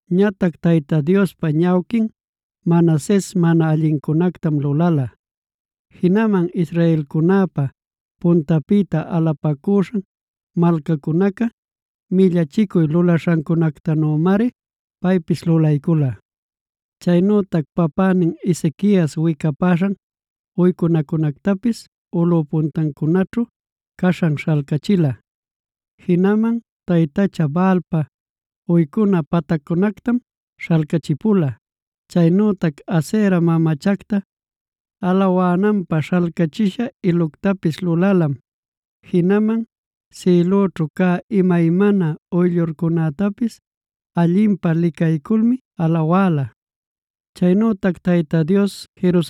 Ñatac Tayta Diospa ñawquin Manases mana allincunactam lulala.a Jinaman israelcunäpa puntanpïta alapacuśhan malcacunaca millachicuy lulaśhancunactanümari paypis lulaycula. Chaynütac papänin Ezequias wicapaśhan uycunacunätapis ulꞌup puntancunaćhu caśhanmi śhalcachila. Jinaman taytacha Baalpa uycuna pactaccunactam śhalcachipula; chaynütac Asera mamachacta alawananpä śhalcachisha iluctapis lulalam. Jinaman sïlüćhu cä imaymana uyllurcunätapis allinpä licayculmi alawala. Chaynütac Tayta Dios: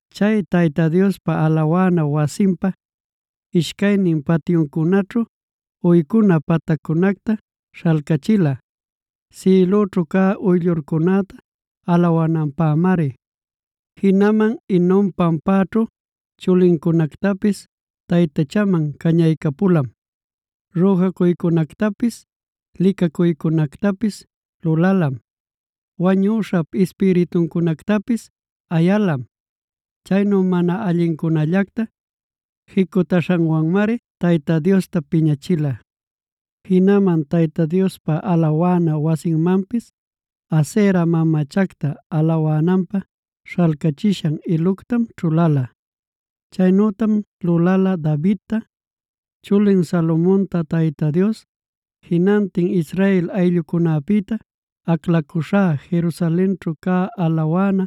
Chay Tayta Diospa alawana wasinpa ishcaynin patyuncunaćhu, uycuna pataccunacta śhalcächila sïlüćhu cä uyllurcunäta alawananpämari. Jinaman Hinom pampaćhu chulincunactapis taytachanman cañaycapulam; rüjacuycunactapis licacuycunactapis lulalam. Wañüśhap ispirituncunactapis ayalam. Chaynu mana allincunallacta jicutaśhanwanmari Tayta Diosta piñachila. Jinaman Tayta Diospa alawana wasinmanpis Asera mamachacta alawananpä śhalcachishan iluctam ćhuläla. Chaynütam lulala Davidta, chulin Salomonta Tayta Dios: “Jinantin Israel ayllucunapïta aclacuśhá Jerusalenćhu cä alawana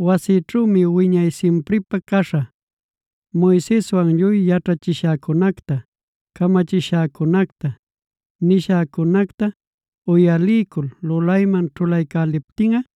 wasïćhümi wiñay simpripä caśhä. Moiseswan lluy yaćhachishäcunacta, camachishäcunacta, nishäcunacta uyalicul lulayman ćhulaycäliptinꞌa,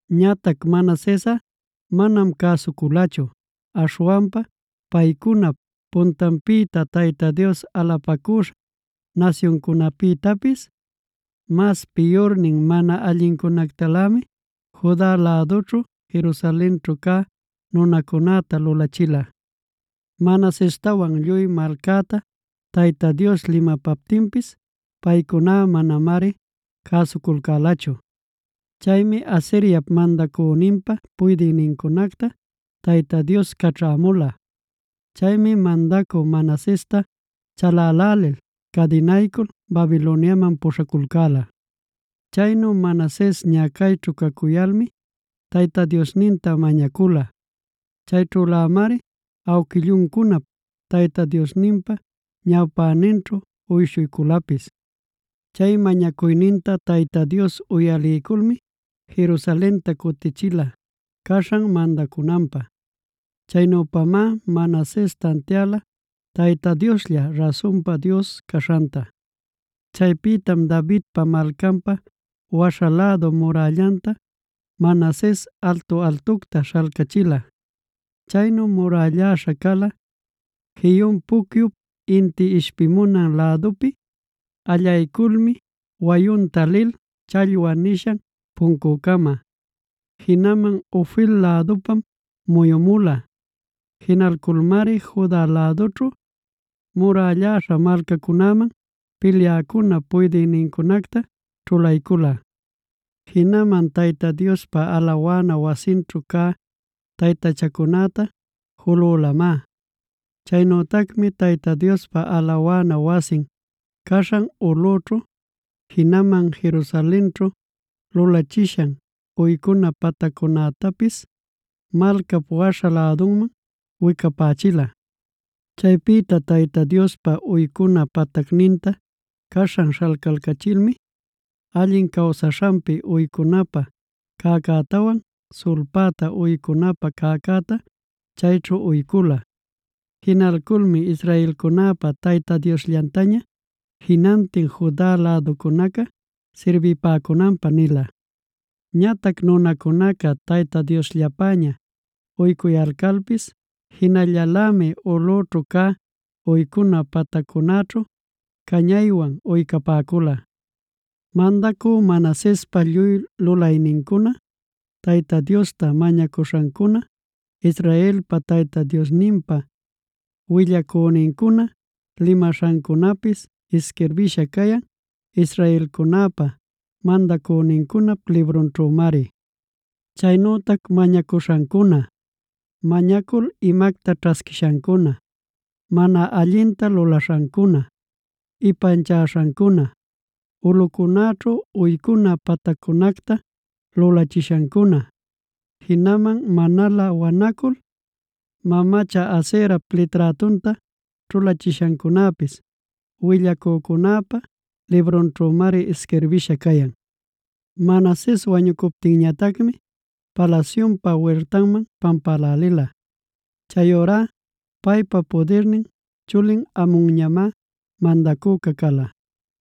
Ñatac Manasesꞌa manam cäsuculachu. Aśhwanpa paycunap puntanpïta Tayta Dios alapacuśhan nasyuncunapïtapis mas piyurnin, mana allincunactalämi Juda lädućhu, Jerusalenćhu cä nunacunäta lulachila. Manasestawan lluy malcäta Tayta Dios limapaptinpis paycuná manamari cäsuculcälachu. Chaymi Asiriap mandacüninpa puydïnincunacta Tayta Dios caćhämula. Chaymi mandacü Manasesta chalälälil cadinaycul Babiloniaman puśhaculcäla. Chaynu Manases ñacayćhu cacuyalmi Tayta Diosninta mañacula. Chayćhülämari awquilluncunap Tayta Diosninpa ñawpäninćhu uyshuyculapis. Chay mañacuyninta Tayta Dios uyaliyculmi Jerusalenta cutichila caśhan mandacunanpä. Chaynüpamá Manases tantiala Tayta Dioslla rasunpa Dios caśhanta. Chaypïtam Davidpa Malcanpa waśha lädu murällanta, Manases altu-altucta śhalcachila. Chaynu murälläśha cala Gihon pucyup inti ishpimunan lädupi allayculmi wayunta lil Challwa nishan puncucama; jinaman Ofel lädunpam muyumula. Jinalculmari Juda lädućhu murälläśha malcacunäman pilyäcunap puydïnincunacta ćhulaycula. Jinaman Tayta Diospa alawana wasinćhu cä taytachacunäta julülamá. Chaynütacmi Tayta Diospa alawana wasin caśhan ulꞌućhu, jinaman Jerusalenćhu lulachishan uycuna pataccunätapis malcap waśha lädunman wicapächila. Chaypïta Tayta Diospa uycuna patacninta caśhan śhalcalcachilmi, allin cawsaśhanpi uycunapä cäcätawan sulpäta uycunapä cäcäta chayćhu uycula. Jinalculmi israelcunäpa Tayta Diosllantaña jinantin Juda läducunaca sirbipäcunanpä nila. Ñatac nunacunaca Tayta Diosllapäña uycuyalcalpis jinallalämi ulꞌućhu cä uycuna pataccunäćhu cañaywan uycapäcula. Mandacü Manasespa lluy lulaynincuna, Tayta Diosta mañacuśhancuna, Israelpa Tayta Diosninpa willacünincuna limaśhancunapis isquirbïsha cayan israelcunäpa mandacünincunap librunćhümari. Chaynütac mañacuśhancuna, mañacul imacta ćhasquishancuna, mana allinta lulaśhancuna, ipanchaśhancuna, ulꞌucunäćhu uycuna pataccunacta lulachishancuna, jinaman manalä wanacul mamacha Aserap liträtunta ćhulachishancunapis willacücunäpa librunćhümari isquirbïsha cayan. Manases wañucuptinñatacmi palasyunpa wirtanman pampälälila. Chayurá paypa pudirnin chulin Amonñamá mandacüca cala.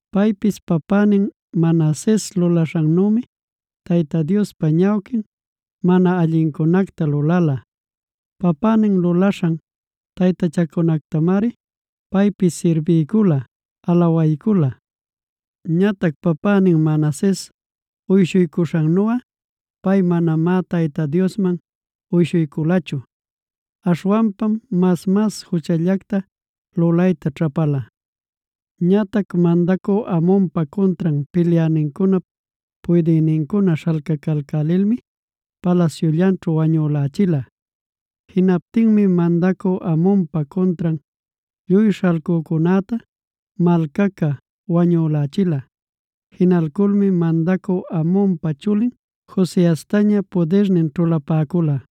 Paypis papänin Manases lulaśhannümi Tayta Diospa ñawquin mana allincunacta lulala. Papänin lulaśhan taytachacunactamari paypis sirbiycula, alawaycula. Ñatac papänin Manases uyshuycuśhannuꞌa pay manamá Tayta Diosman uyshuyculachu. Aśhwanpam mas-mas juchallacta lulayta ćhapala. Ñatac mandacü Amonpa cuntran pilyänincunap puydïnincuna śhalcalcälilmi palasyullanćhu wañülächila. Jinaptinmi mandacü Amonpa cuntran lluy śhalcücunäta malcaca wañülächila. Jinalculmi mandacü Amonpa chulin Josiastaña pudirnin ćhulapäcula.